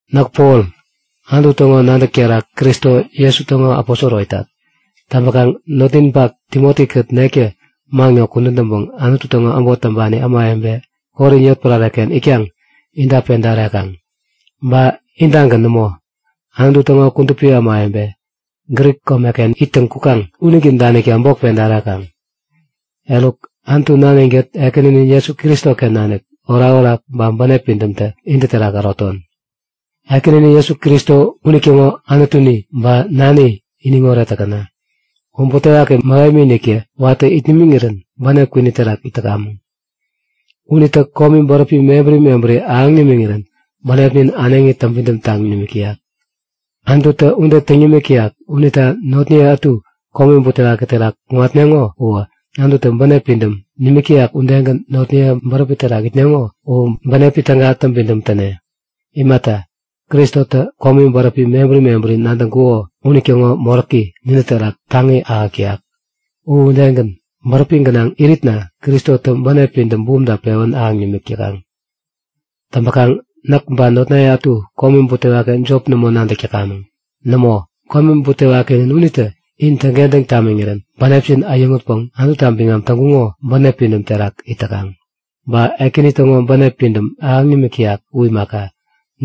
Näk Pol Anutu täŋo nadäk terak Kristo Jesu täŋo aposoro itat. Täŋpäkaŋ notninpak Timoti-kät nektä man ŋo kudän täŋpäŋ Anutu täŋo äbot täŋpani ämawebe Korin yotpärare-ken itkaŋ inta peda ärekaŋ. Ba intagän nämo, Anutu täŋo kudupi ämawebe Grik komeken ittäŋ kukaŋ unitä danikta bok peda ärekaŋ. Eruk Anutu Nanin-kät Ekäninin Jesu Kristoken nanik orakorak ba bänep pidämtä intä terak äroton. Ekäninin Jesu Kristo unitäŋo Anutuni ba Nani iniŋoret täkäna! U butewaki mähemi-iniktä watä it nimiŋirän bänep kwini terak it täkamäŋ. Unitä komi bäräpi mebäri mebäri ahäŋ nimiŋirän bänepnin äneŋi täŋpidäm taŋ nimik täyak. Anututä ude täŋ nimik täyak unita notniye ätu komi butewaki terak kuŋatneŋo uwä, Anututä bänep pidäm nimik täyak udegän notniye bäräpi terak itneŋo u bänepi täga täŋpidäm täne. Imata, Kristotä komi bäräpi mebäri mebäri nadäk täŋkuko unitäŋo moräki nintä terak taŋi ahäk täyak. U udegän, bäräpi gänaŋ iritna Kristotä bänep pidäm bumta pewän ahäŋ nimik täkaŋ. Täŋpäkaŋ näk ba notnaye ätu komi butewaki jop nämo nadäk täkamäŋ. Nämo, komi butewakinin unitä in täŋkentäŋ tamiŋirän bänepjin äyäŋutpäŋ Anututa biŋam täŋkuŋo bänep pidäm terak it täkaŋ. Ba Ekäni täŋo bänep pidäm ahäŋ nimik täyak u imaka,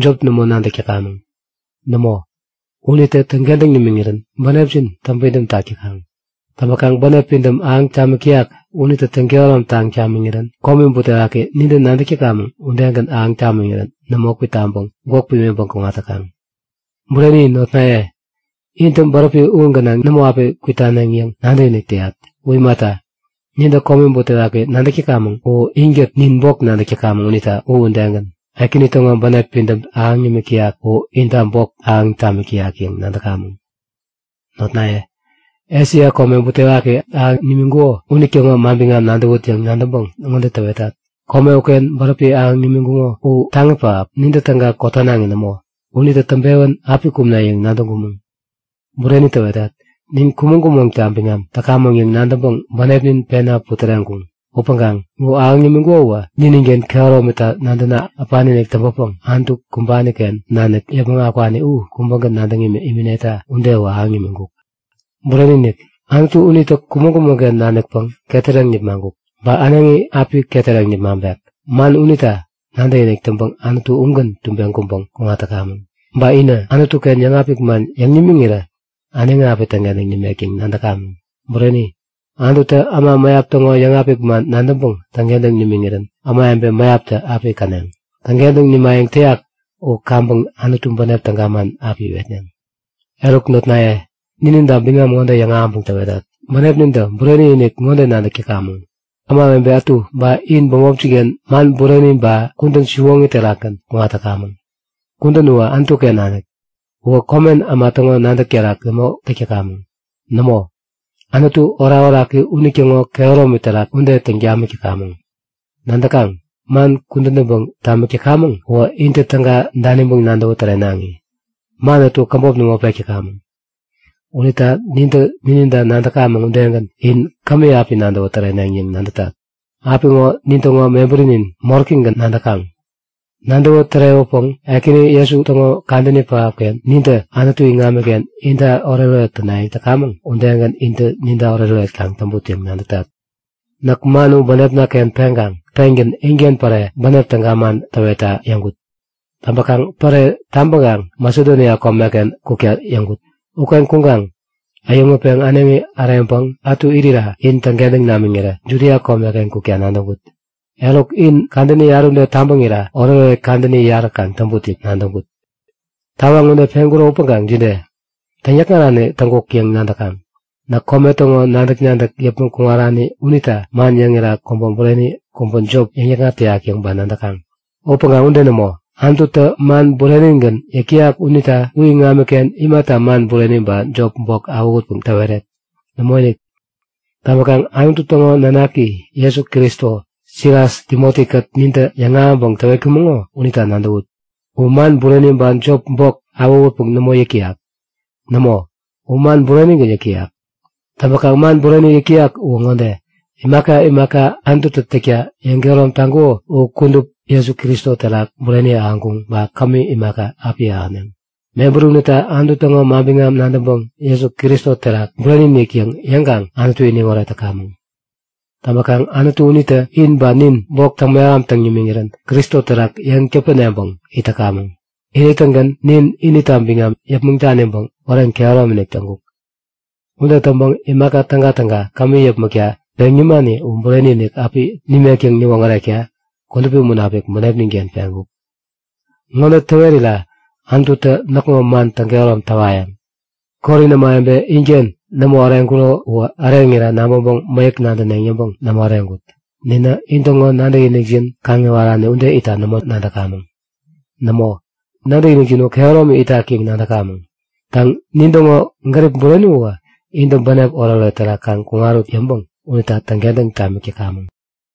jop nämo nadäk täkamäŋ. Nämo, unitä täŋkentäŋ tamiŋirän bänepjin täŋpidäm tak täkaŋ. Täŋpäkaŋ bänep pidäm ahäŋ tamik täyak unitä täŋ-kehäromtaŋ tamiŋirän komi butewaki nintä nadäk täkamäŋ udegän ahäŋ tamiŋirän nämo kwitaŋpäŋ gwäk pimiŋpäŋ kuŋat täkaŋ. Bureni notnaye, intä bäräpi u gänaŋ nämo api kwitaneŋ yäŋ nadäkinik täyat. U imata, nintä komi butewaki nadäk täkamäŋ u inkät nin bok nadäk täkamäŋ unita u udegän, Ekäni täŋo bänep pidäm ahäŋ nimik täyak u inta bok ahäŋ tamik täyak yäŋ nadäkamäŋ. Notnaye, Esia komeken komi butewaki ahäŋ nimiŋkuko unitäŋo manbiŋam nadäwut yäŋ nadäŋpäŋ ŋode täwetat; Kome uken bäräpi ahäŋ nimiŋkuko u taŋi pähap, nintä täga kotanaŋi nämo. Unitä täŋpewän api kumne yäŋ nadäŋkumäŋ. Bureni täwetat. Nin kumäŋ-kumäŋta biŋam täkamäŋ yäŋ nadäŋpäŋ bänepnin pena putäreŋkuŋ. Upäŋkaŋ u ahäŋ nimiŋkuko uwä nininken kehäromita nadäna äpani-inik täŋpäpäŋ Anutu kumbani-ken nanik yäpmäŋ akwani u kubägän nadäŋ imineta ude uwä ahäŋ nimiŋkuk. Bureni-inik, Anutu unitä kumäŋ-kumäŋ-ken nanikpäŋ ketäreŋ nipmaŋkuk. Ba äneŋi api ketäreŋ nipmaŋpek. Man unita nadäkinik täŋpäŋ Anutu ugän tubeŋ kuŋpäŋ kuŋat täkamäŋ. Ba inä Anutu-ken yäŋapik man yäŋ nimiŋirä äneŋi api täŋkentäŋ nimek yäŋ nadäkamäŋ. Bureni, Anututä äma mäyap täŋo yäŋapik man nadäŋpäŋ täŋkentäŋ nimiŋirän ämawebe mäyaptä api käneŋ. Täŋkentäŋ nimayäŋ täyak u kaŋpäŋ Anutu bänep täga man api iwetneŋ. Eruk notnaye, nininta biŋam ŋode yäŋahäŋpäŋ täwetat; Bänepnintä bureni-inik ŋode nadäk täkamäŋ; Ämawebe ätu ba in bämopjin-ken man bureni ba kudän siwoŋi terakgän kuŋat täkamäŋ. Kudän uwä Anutu-ken nanik. Uwä komen äma täŋo nadäk terak nämo täk täkamäŋ. Nämo, Anutu orakoraki unitäŋo kehäromi terak ude täŋ tamik täkamäŋ. Nadäkaŋ? Man kudän täŋpäŋ tamik täkamäŋ uwä intä täga daniŋpäŋ nadäwä tärenaŋi. Man ätu käbop nämo pek täkamäŋ. Unita nintä nininta nadäkamäŋ udegän in kämi api nadäwä täreneŋ yäŋ nadätat. Apiŋo nintäŋo mebärinin moräkigän nadäkaŋ. Nadäwä tärewäpäŋ Ekäni Jesu täŋo kadäni pähapken nintä Anutu iŋamiken inta oretoret tänayäŋ täkamäŋ udegän intä ninta oretoret kaŋ täŋput yäŋ nadätat. Näk man u bänepna-ken peŋkaŋ pengän inken päre bänep täga man täwetta yäŋkut. Täŋpäkaŋ päre tabäŋkaŋ Masedonia komeken kukta yäŋkut. Uken kuŋatkaŋ äyäŋutpeŋ äneŋi äreŋpäŋ ätu irira in täŋkentäŋ namiŋirä Judia komeken kukta nadäŋkut. Eruk, in kadäni yarä ude tabäŋira oretoret kadäni yarä kaŋ täŋput yäŋ nadäŋkut. Tawaŋ ude peŋkuro upäŋkaŋ jide? Täŋnikŋarani täŋkuk yäŋ nadäkaŋ? Näk kome täŋo nadäk-nadäk yäpmäŋ kuŋarani unita man yäŋira kubä bureni, kubä jop yäŋnikŋat täyak yäŋ ba nadäkaŋ? Upäŋkaŋ ude nämo, Anututä man burenigän yäk täyak unita u iŋamiken imata man bureni ba jopi bok awähutpäŋ täweret? Nämoinik! Täŋpäkaŋ Anutu täŋo nanaki Jesu Kristo, Silas Timoti-kät nintä yäŋahäŋpäŋ täwetkumäŋo unita nadäwut; U man bureni ba jopi bok awähutpäŋ nämo yäk täyak. Nämo, u man burenigän yäk täyak. Täŋkaŋ man bureni yäk täyak uwä ŋode; Imaka imaka Anututä täkta yäŋkehärom taŋkuko u kudup Jesu Kristo terak bureni ahäŋkuŋ ba kämi imaka, api ahäneŋ. Mebäri unita Anutu täŋo manbiŋam nadäŋpäŋ Jesu Kristo terak bureni-inik yäŋ yäŋkaŋ Anutu iniŋoret täkamäŋ. Täŋpäkaŋ Anutu unitä in ba nin bok täŋ-mehamtaŋ nimiŋirän Kristo terak yeŋ täpäneŋpäŋ it täkamäŋ. Ini-tägän nin inita biŋam yäpmäŋ daniŋpäŋ wären kehäromi-inik täŋkuk. Ude täŋpäŋ imaka tägatäga kämi yäpmäkta peŋ nimani u bureni-inik api nimek yäŋ niwoŋärekta Kudupi Munapik bänepnin-ken peŋkuk. Ŋode täwerira Anututä näkŋo man täŋkehärom täwayäŋ; Korin ämawebe inken nämo äreŋkuro uwä äreŋira nabäŋpäŋ mäyäk nadäneŋ yäŋpäŋ nämo äreŋkut. Ninä intäŋo nadäkinikjin kaŋiwarani ude itta nämo nadäkamäŋ. Nämo, nadäkinikjin u kehäromi itak yäŋ nadäkamäŋ. Täŋ, nintäŋo gärip bureni uwä intä bänep oretoret terak kaŋ kuŋarut yäŋpäŋ unita täŋkentäŋ tamik täkamäŋ.